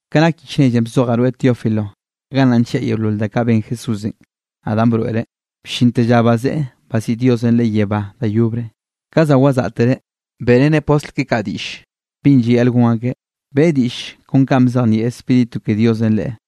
Ke nak yich nellenꞌ bzojaꞌ rweꞌ Teófilo, gannaꞌ nlliaꞌ yeolol da kaꞌ ben Jesúsenꞌ, naꞌ danꞌ broeꞌreꞌ bllinte lla bazeꞌe baziꞌi Diosenꞌ Leꞌe yebá da yobre. Ka za wazaꞌtereꞌ, beꞌreneꞌ postl keꞌe kaꞌ diꞌll binꞌ llayaꞌl gon akeꞌ, beꞌe diꞌll kon kaꞌ bzejnieꞌ Spíritu ke Diosenꞌ Leꞌe.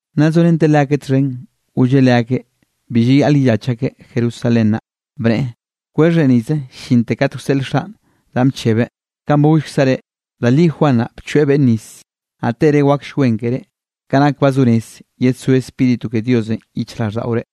Nna zorenteꞌ leakeꞌ txhen, golleꞌ leakeꞌ bi llayaꞌl yellach akeꞌ Jerusalén naꞌ, bneꞌe: —Kwexhre nize llinte kat wseꞌl Xaꞌn danꞌ bchebeꞌ, kanꞌ ba gollkzaꞌ reꞌ. Da li Juan naꞌ bchoeꞌ beꞌnn nis, naꞌ tere wakll wen ke reꞌ, ke nak ba zo rez yedsó Spíritu ke Diosenꞌ yichjraꞌlldaꞌore.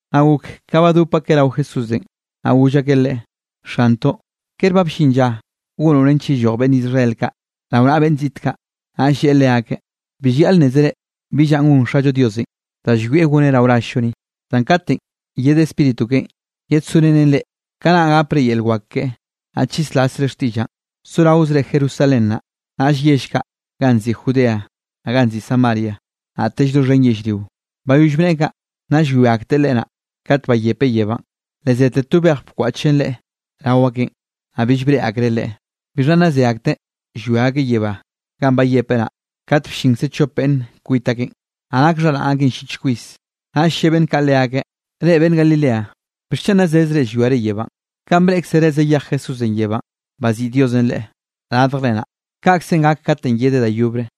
Naꞌ gok ka badop akeꞌ rao Jesúsenꞌ, naꞌ goll akeꞌ Leꞌe: —Xantoꞌ, ¿kere ba bllin lla gonoꞌ nench yelloj beꞌnn Israel kaꞌ rao naꞌa beꞌnn ziꞌt kaꞌ? Naꞌll lleꞌe leakeꞌ: —Bi llayaꞌl nnézere bi llanꞌ gon Xallo Diosenꞌ da llwieꞌ goneꞌ rao rall-llo ni. Zan katenꞌ yed Spíritu keꞌen yedsorenen reꞌ, kanaꞌ gapre yel wak keꞌe, naꞌ chislasre xtiꞌllaꞌn, soraozre Jerusalén naꞌ, naꞌll yell kaꞌ ganꞌ nziꞌi Judea, naꞌ ganꞌ nziꞌi Samaria, naꞌtell doxhen yellrio. Bayoll bneꞌe kaꞌ, naꞌ llwia akteꞌ Leꞌe naꞌ, kat bayepeꞌ yebánꞌ, le zete to bej bkwaꞌchen Leꞌe rao akeꞌn, naꞌ bill breꞌe akreꞌ Leꞌe. Bixha nna ze akteꞌ llwia akeꞌ yebá ganꞌ bayepeꞌ naꞌ, kat bllinkze chop beꞌnn kwit akeꞌn, naꞌ nak xharaꞌn akeꞌ llich kwis. Naꞌll lle beꞌnn kaꞌ leakeꞌ: —Reꞌ beꞌnn Galilea, ¿bixchen nna zezre llwiare yebánꞌ? Kanꞌ breꞌkzere zayej Jesúsenꞌ yebánꞌ, baziꞌi Diosenꞌ Leꞌe radjre naꞌ, kaꞌkze gak katenꞌ yedeꞌ da yobre.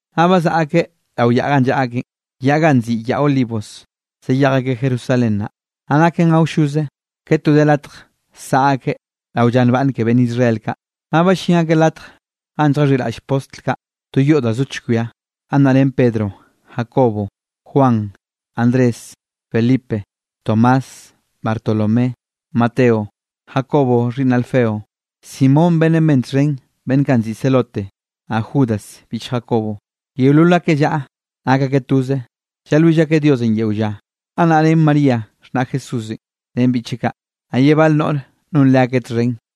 Naꞌ bazaꞌa akeꞌ rao yaꞌ ganꞌ llaꞌa akeꞌn, yaꞌ ganꞌ nziꞌi Yaꞌ Olivos, zayej akeꞌ Jerusalén naꞌ. Naꞌ naken awlloze, ke to de latj saꞌa akeꞌ rao lla nbaꞌnne ke beꞌnn Israel kaꞌ. Naꞌ ballín akeꞌ latj ganꞌ lljaxhiꞌraꞌll postl kaꞌ, to yoꞌ da zo chkwia. Gannaꞌ ren Pedro, Jacobo, Juan, Andrés, Felipe, Tomás, Bartolomé, Mateo, Jacobo xhiꞌnn Alfeo, Simón beꞌnn ben txhen beꞌnn kaꞌ nziꞌi Zelote, naꞌ Judas biꞌch Jacobo. Yeolol akeꞌ llaꞌa nak akeꞌ toze, llalwill akeꞌ Diosenꞌ yeo lla. Gannaꞌ ren María xhnaꞌ Jesúsenꞌ ren biꞌcheꞌ kaꞌ, naꞌ ye bal noꞌr non leakeꞌ txhen.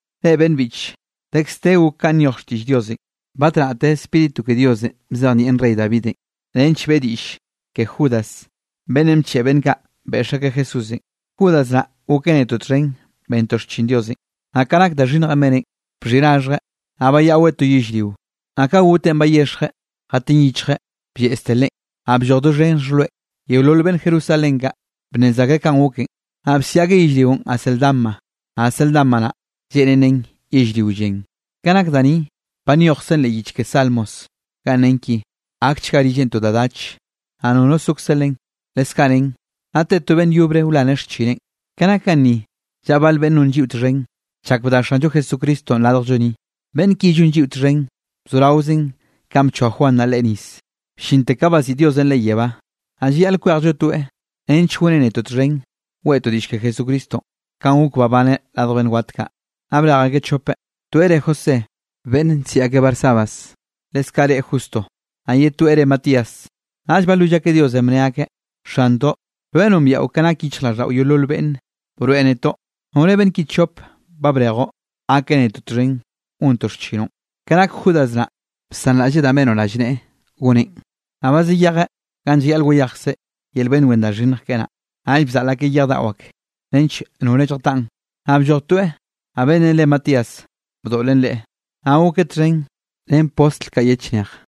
—Reꞌ beꞌnn biꞌche, dekz de gok kanꞌ nyoj xtiꞌll Diosenꞌ. Batnaꞌte Spíritu ke Diosenꞌ bzejnieꞌn rey Davidenꞌ, nench beꞌe diꞌll ke Judas beꞌnnenꞌ bcheꞌe beꞌnn kaꞌ beꞌx akeꞌ Jesúsenꞌ. Judas naꞌ gokeꞌ netoꞌ txhen bentoꞌ xchin Diosenꞌ. Naꞌ ka nak da xhinnjenꞌ beneꞌn, bxhiꞌi raxhjeꞌ, naꞌ bayaꞌweꞌ to yellrio. Naꞌ ka goteꞌn bayexjeꞌ jatin yichjeꞌ, blleꞌzte leꞌen, naꞌ blloj doxhen xhojloeꞌ. Yeolol beꞌnn Jerusalén kaꞌ, bnnez akreꞌ kanꞌ goken, naꞌ bsiꞌi akeꞌ yellrionꞌ Acéldama, naꞌ Acéldama naꞌ lleꞌnen nen Yellrio Llen. Ke nak da ni, ba nyojkzen leꞌ yich ke Salmos ganꞌ nen ki: Gakchga rilleꞌn to da dach, naꞌ nono sokze len. Leskaꞌ nen: Naꞌ te to beꞌnn yobre wlaneꞌ xchineꞌn. ’Ke nak ganni llaꞌa bal beꞌnn non lliꞌo txhen, chak bda Xanllo Jesucristo radjllo ni, beꞌnn ki llon lliꞌo txhen, bzoraozen kanꞌ bchoa Juan naꞌ Leꞌe nis, bllinte ka baziꞌi Diosenꞌ Leꞌe yebá. Naꞌ llayaꞌl kwejllo toeꞌ, nench goneꞌ netoꞌ txhen, weꞌtoꞌ diꞌll ke Jesucristonꞌ kanꞌ gok babaneꞌ radj beꞌnn wat kaꞌ. Naꞌ brej akeꞌ chopeꞌ, toeꞌ re José beꞌnn nsiꞌi akeꞌ Barsabás, leskaꞌ re Justo, naꞌ ye toeꞌ re Matías. Naꞌll balwill akeꞌ Diosenꞌ bne akeꞌ: —Xantoꞌ, rweꞌ nombiaꞌo ke nak yichjraꞌlldaꞌo yeolol beꞌnne, broeꞌ netoꞌ nore beꞌnn ki chop, ba brejoꞌ gakeꞌ netoꞌ txhen gontoꞌ xchinoꞌn. Ke nak Judas naꞌ, bsanraꞌlleꞌ danꞌ benoꞌ rallneꞌe goneꞌn, naꞌ ba zayejeꞌ ganꞌ llayaꞌl wayejkzeꞌ yel beꞌnn wen da xhinnj keꞌe naꞌ. Naꞌll bzaꞌl akeꞌ yej daꞌo ak, nench nore lljataꞌn, naꞌ blloj toeꞌ, naꞌ beꞌnnenꞌ re Matías bdoꞌlen leꞌe, naꞌ gokeꞌ txhen ren postl kaꞌ ye chnej.